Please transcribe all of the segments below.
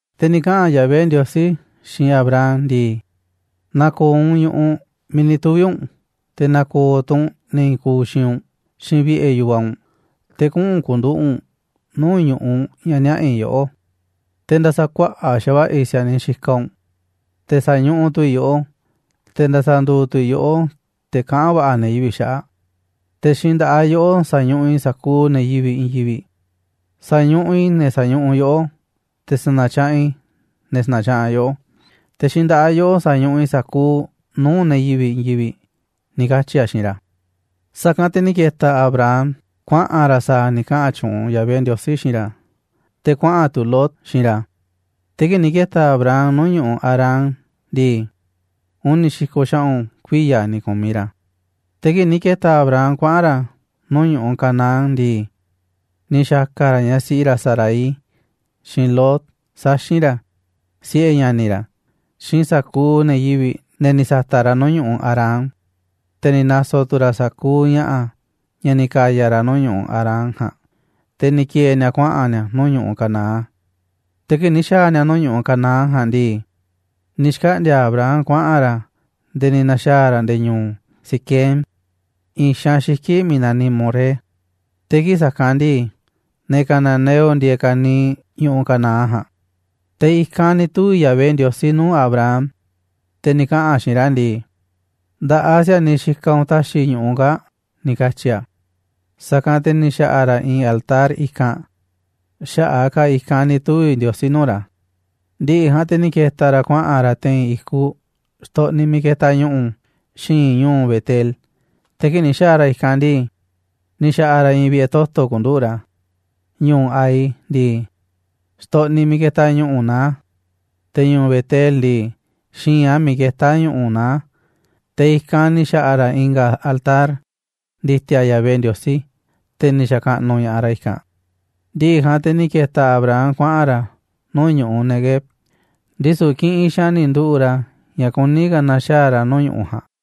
Te̱ ni̱ kaꞌa̱n Yahvé Ndiosí xiinꞌ Abram ndii: ―Na̱ko̱o̱ u̱nꞌ ñu̱ꞌuꞌ miiꞌ ni̱ tuvi̱ u̱nꞌ, te̱ na̱ko̱o̱ tu̱ u̱nꞌ ne̱ i̱i̱n kuuꞌ xiinꞌ u̱nꞌ, xiinꞌ vi̱ꞌe̱ yu̱vaꞌ u̱nꞌ, te̱ kuꞌu̱n ku̱nduꞌu̱ꞌ u̱nꞌ nuu̱ꞌ ñu̱ꞌuꞌ ña̱ niaꞌa̱ i̱ yoꞌó. Te̱ nda̱sa̱kuaꞌa̱ꞌ xa̱va̱ꞌa̱ i̱ si̱a̱niꞌ xikaꞌ u̱nꞌ, te̱ sa̱ñuꞌuꞌ tu̱ i̱ yoꞌó, te̱ nda̱sa̱nduuꞌ tu̱ i̱ yoꞌó te̱ kaꞌán va̱ꞌa̱ ne̱ yivi̱ꞌ xaꞌa̱ꞌ, te̱ xiinꞌ nda̱ꞌaꞌ yoꞌó sa̱ñuꞌuꞌ i̱ sa̱kuuꞌ ne̱ yivi̱ꞌ i̱i̱n yivi̱ꞌ. Sa̱ñuꞌuꞌ i̱ ne̱ sa̱ñuꞌuꞌ yoꞌó, te̱ sa̱na̱tyaꞌanꞌ i̱ ne̱ sa̱na̱tyaꞌanꞌ yoꞌó. Te̱ xiinꞌ nda̱ꞌaꞌ yoꞌó sa̱ñuꞌuꞌ i̱ sa̱kuuꞌ nuu̱ꞌ ne̱ yivi̱ꞌ i̱i̱n yivi̱ꞌ ―ni̱ katyi̱ a̱ xiinꞌ ra̱. Sa̱kanꞌ te̱ ni̱ ke̱ta̱ Abram kuaꞌa̱n ra̱ sa̱a̱ ni̱ kaꞌa̱n tyuunꞌ Yahvé Ndiosí xiinꞌ ra̱, te̱ kuaꞌa̱n tu̱ Lot xiinꞌ ra̱. Te̱ kii̱ꞌ ni̱ ke̱ta̱ Abram nuu̱ꞌ ñu̱ꞌuꞌ Harán ndii, uni̱ xi̱ko̱ xaꞌu̱n kuiya̱ ni̱ ku̱miꞌ ra̱. Te̱ kii̱ꞌ ni̱ ke̱ta̱ Abram kuaꞌa̱n ra̱ nuu̱ꞌ ñu̱ꞌuꞌ Canaán ndii, ni̱ xa̱ka̱ ra̱ ñaꞌ siꞌi ra̱ Sarai, xiinꞌ Lot, saxi̱n ra̱, siꞌe̱ ña̱ni̱ ra̱, xiinꞌ sa̱kuuꞌ ne̱ yivi̱ꞌ, ne̱ ni̱ sa̱ta̱ꞌ ra̱ nuu̱ꞌ ñu̱ꞌuꞌ Harán, te̱ ni̱ na̱so̱ tu̱ ra̱ sa̱kuuꞌ ña̱ꞌa̱, ña̱ ni̱ ka̱ya̱ ra̱ nuu̱ꞌ ñu̱ꞌuꞌ Harán ja̱a̱nꞌ, te̱ ni̱ ki̱e̱e̱ ni̱a̱ kuaꞌa̱n ni̱a̱ nuu̱ꞌ ñu̱ꞌuꞌ Canaán. Te̱ kii̱ꞌ ni̱ xa̱a̱ ni̱a̱ nuu̱ꞌ ñu̱ꞌuꞌ Canaán ja̱a̱nꞌ ndii, ni̱ xkaꞌndi̱a̱ Abram kuaꞌa̱n ra̱ nde̱e̱ ni̱ na̱xaa̱ ra̱ nde̱e̱ ñu̱u̱ Siquem, i̱i̱n xaanꞌ xiki̱ꞌ miiꞌ naniꞌ Moré. Te̱ kii̱ꞌ sa̱kanꞌ ndii, ne̱ cananeo ndieeꞌ ka̱niiꞌ ñu̱ꞌuꞌ Canaán ja̱a̱nꞌ. Te̱ i̱kanꞌ ni̱ tuvi̱ Yahvé Ndiosí nuu̱ꞌ Abram, te̱ ni̱ kaꞌa̱n a̱ xiinꞌ ra̱ ndii: ―Nda̱ꞌaꞌ si̱a̱niꞌ xikaꞌ u̱nꞌ ta̱xi̱ i̱ ñu̱ꞌuꞌ kaa̱ꞌ ―ni̱ katyi̱ a̱. Sa̱kanꞌ te̱ ni̱ xa̱ꞌa̱ ra̱ i̱i̱n altar i̱kanꞌ, xaꞌa̱ꞌ a̱ ka̱ i̱kanꞌ ni̱ tuvi̱ Ndiosí nuu̱ꞌ ra̱. Ndi̱ꞌi̱ ja̱a̱nꞌ te̱ ni̱ ke̱ta̱ ra̱ kuaꞌa̱n ra̱ te̱i̱n i̱kuꞌ xtoꞌniꞌ miiꞌ ketaꞌ ñu̱ꞌu̱ xi̱i̱nꞌ ñu̱u̱ Betel, te̱ kii̱ꞌ ni̱ xa̱a̱ ra̱ i̱kanꞌ ndii, ni̱ xa̱ꞌa̱ ra̱ i̱i̱n vi̱ꞌe̱ toto̱ ku̱nduꞌu̱ꞌ ra̱. Ñu̱u̱ Ai ndii, xtoꞌniꞌ miiꞌ ketaꞌ ñu̱ꞌu̱ naá a̱, te̱ ñu̱u̱ Betel ndii, xi̱i̱nꞌ a̱ miiꞌ ketá ñu̱ꞌu̱ naá a̱, te̱ i̱kanꞌ ni̱ xa̱ꞌa̱ ra̱ i̱nga̱ altar ndi̱ti̱a̱ Yahvé Ndiosí, te̱ ni̱ xa̱kaꞌnuꞌ ña̱ꞌaꞌ ra̱ i̱kanꞌ. Ndi̱ꞌi̱ ja̱a̱nꞌ te̱ ni̱ ke̱ta̱ Abram kuaꞌa̱n ra̱ nuu̱ꞌ ñu̱ꞌuꞌ Neguev, ndisu̱ kiꞌinꞌ xaanꞌ ni̱ nduꞌu̱ꞌ ra̱ ña̱ kuní ka̱ na̱xaa̱ ra̱ nuu̱ꞌ ñu̱ꞌuꞌ ja̱a̱nꞌ.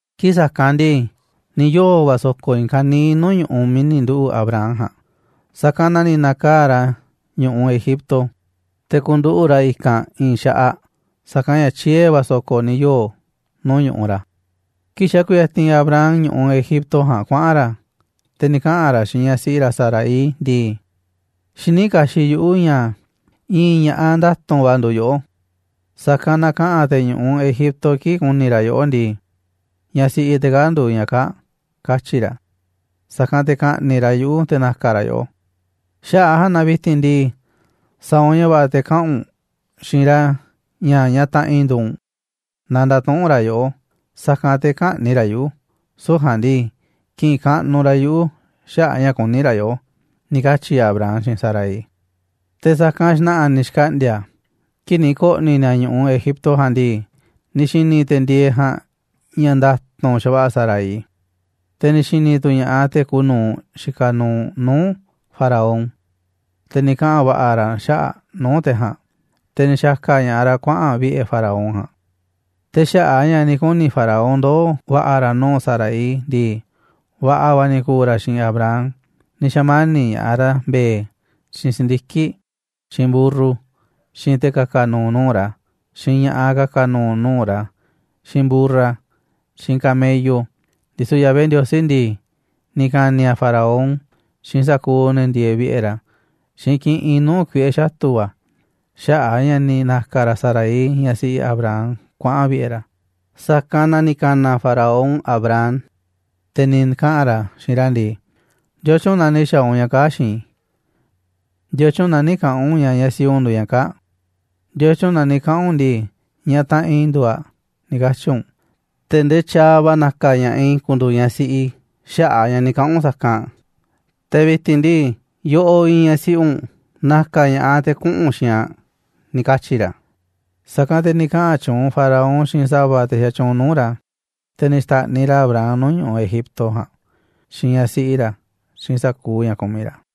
Kii̱ꞌ sa̱kanꞌ ndii, ni̱ yoo̱ va̱ so̱ko̱ i̱i̱n ka̱niiꞌ nuu̱ꞌ ñu̱ꞌuꞌ miiꞌ ni̱ nduꞌu̱ꞌ Abram ja̱a̱nꞌ, sa̱kanꞌ na ni̱ na̱kaa̱ꞌ ra̱ ñu̱ꞌuꞌ Egipto te̱ ku̱nduꞌu̱ꞌ ra̱ i̱kanꞌ i̱i̱n xaꞌaꞌ, sa̱kanꞌ ña̱ tyie̱ va̱ so̱ko̱ ni̱ yoo̱ nuu̱ꞌ ñu̱ꞌuꞌ ra̱. Kii̱ꞌ xa̱ kuyatinꞌ Abram ñu̱ꞌuꞌ Egipto ja̱a̱nꞌ kuaꞌa̱n ra̱, te̱ ni̱ kaꞌa̱n ra̱ xiinꞌ ñaꞌ siꞌi ra̱ Sarai ndii: ―Xiní kaxiꞌ yuꞌu̱ ña̱ i̱i̱n ña̱ꞌaꞌ nda̱tu̱nꞌ va̱ nduuꞌ yoꞌó, sa̱kanꞌ na kaꞌa̱n te̱ ñu̱ꞌuꞌ Egipto kii̱ꞌ ku̱ni̱ ra̱ yoꞌó ndii: "Ñaꞌ siꞌi te̱ kaa̱ꞌ nduuꞌ ñaꞌ kaa̱ꞌ", katyi̱ ra̱. Sa̱kanꞌ te̱ ka̱ꞌni̱ꞌ ra̱ yuꞌu̱ te̱ na̱ka̱ ra̱ yoꞌó. Xaꞌa̱ꞌ a̱ ja̱a̱nꞌ na vi̱ti̱n ndii, sa̱a̱ u̱nꞌ ña̱ va̱ꞌa̱ te̱ kaꞌa̱n u̱nꞌ xiinꞌ ra̱ ña̱ ñaꞌ taꞌanꞌ i̱ nduuꞌ u̱nꞌ, naaꞌ nda̱tuꞌu̱nꞌ ra̱ yoꞌó, sa̱kanꞌ te̱ kä̱ꞌni̱ꞌ ra̱ yuꞌu̱, süu̱ꞌ ja̱a̱nꞌ ndii, ki̱ꞌi̱n kaꞌnuꞌ ra̱ yuꞌu̱ xaꞌa̱ꞌ a̱ ña̱ kuní ra̱ yoꞌó ―ni̱ katyi̱ Abram xiinꞌ Sarai. Te̱ sa̱kanꞌ xna̱ꞌa̱ ni̱ xkaꞌndi̱a̱ kii̱ꞌ ni̱ ko̱ꞌni̱ ni̱a̱ ñu̱ꞌuꞌ Egipto ja̱a̱nꞌ ndii, ni̱ xi̱ni̱ te̱ ndieeꞌ ja̱a̱nꞌ ña̱ nda̱tu̱nꞌ xa̱va̱ꞌa̱ Sarai. Te̱ ni̱ xi̱ni̱ tu̱ ña̱ꞌaꞌ te̱ kuuꞌ nu̱uꞌ xikaꞌ nuuꞌ nuu̱ꞌ Faraón, te̱ ni̱ kaꞌa̱n va̱ꞌa̱ ra̱ xaꞌa̱ꞌ aꞌ nuu̱ꞌ te̱ ja̱a̱nꞌ, te̱ ni̱ xa̱ka̱ ña̱ꞌaꞌ ra̱ kuaꞌa̱n aꞌ vi̱ꞌe̱ Faraón ja̱a̱nꞌ. Te̱ xaꞌa̱ꞌ a̱ ña̱ ni̱ kuni̱ Faraón ndoo̱ va̱ꞌa̱ ra̱ nuu̱ꞌ Sarai ndii, va̱ꞌa̱ va̱ ni̱ ku̱u̱ ra̱ xiinꞌ Abram, ni̱ xa̱mani̱ꞌ ña̱ꞌaꞌ ra̱ mbe̱e̱, xiinꞌ si̱ndiki̱ꞌ, xiinꞌ mburru, xiinꞌ te̱ ka̱ka̱ nu̱u̱ nuu̱ꞌ ra̱, xiinꞌ ña̱ꞌaꞌ ka̱ka̱ nu̱u̱ nuu̱ꞌ ra̱, xiinꞌ mburra, xiinꞌ camello. Ndisu̱ Yahvé Ndiosí ndii, ni̱ ka̱ni̱ a̱ Faraón xiinꞌ sa̱kuuꞌ ne̱ ndieeꞌ vi̱ꞌe̱ ra̱ xiinꞌ kiꞌinꞌ nuu̱ꞌ kuiꞌe̱ xatu̱ va̱, xaꞌa̱ꞌ a̱ ña̱ ni̱ na̱ka̱ ra̱ Sarai, ñaꞌ siꞌi Abram, kuaꞌa̱n aꞌ vi̱ꞌe̱ ra̱. Sa̱kanꞌ na ni̱ ka̱na̱ Faraón Abram, te̱ ni̱ kaꞌa̱n ra̱ xiinꞌ ra̱ ndii: ―¿Ndiotyun na ni̱ xa̱a̱ u̱nꞌ ña̱ kaa̱ꞌ xiinꞌ i̱? ¿Ndiotyun na nï̱ kaꞌa̱n u̱nꞌ ña̱ ñaꞌ siꞌi u̱nꞌ nduuꞌ ñaꞌ kaa̱ꞌ? ¿Ndiotyun na ni̱ kaꞌa̱n u̱nꞌ ndii, "ñaꞌ taꞌanꞌ i̱ nduuꞌ aꞌ," ni̱ katyi̱ u̱nꞌ, te̱ ndee tyaaꞌ va̱ na̱ka̱ ña̱ꞌaꞌ i̱ ku̱ndu̱u̱ ñaꞌ siꞌi i̱ xaꞌa̱ꞌ a̱ ña̱ ni̱ kaꞌa̱n u̱nꞌ sa̱kanꞌ? Te̱ vi̱ti̱n ndii, yoꞌoꞌ iinꞌ ñaꞌ siꞌi u̱nꞌ. Na̱ka̱ ña̱ꞌaꞌ te̱ kuꞌu̱n u̱nꞌ xiinꞌ aꞌ ―ni̱ katyi̱ ra̱. Sa̱kanꞌ te̱ ni̱ kaꞌa̱n tyuunꞌ Faraón xiinꞌ sa̱va̱ te̱ xatyuunꞌ nuu̱ꞌ ra̱, te̱ ni̱ xta̱ꞌniꞌ ra̱ Abram nuu̱ꞌ ñu̱ꞌuꞌ Egipto ja̱a̱nꞌ xiinꞌ ñaꞌ siꞌi ra̱, xiinꞌ sa̱kuuꞌ ña̱ kumiꞌ ra̱.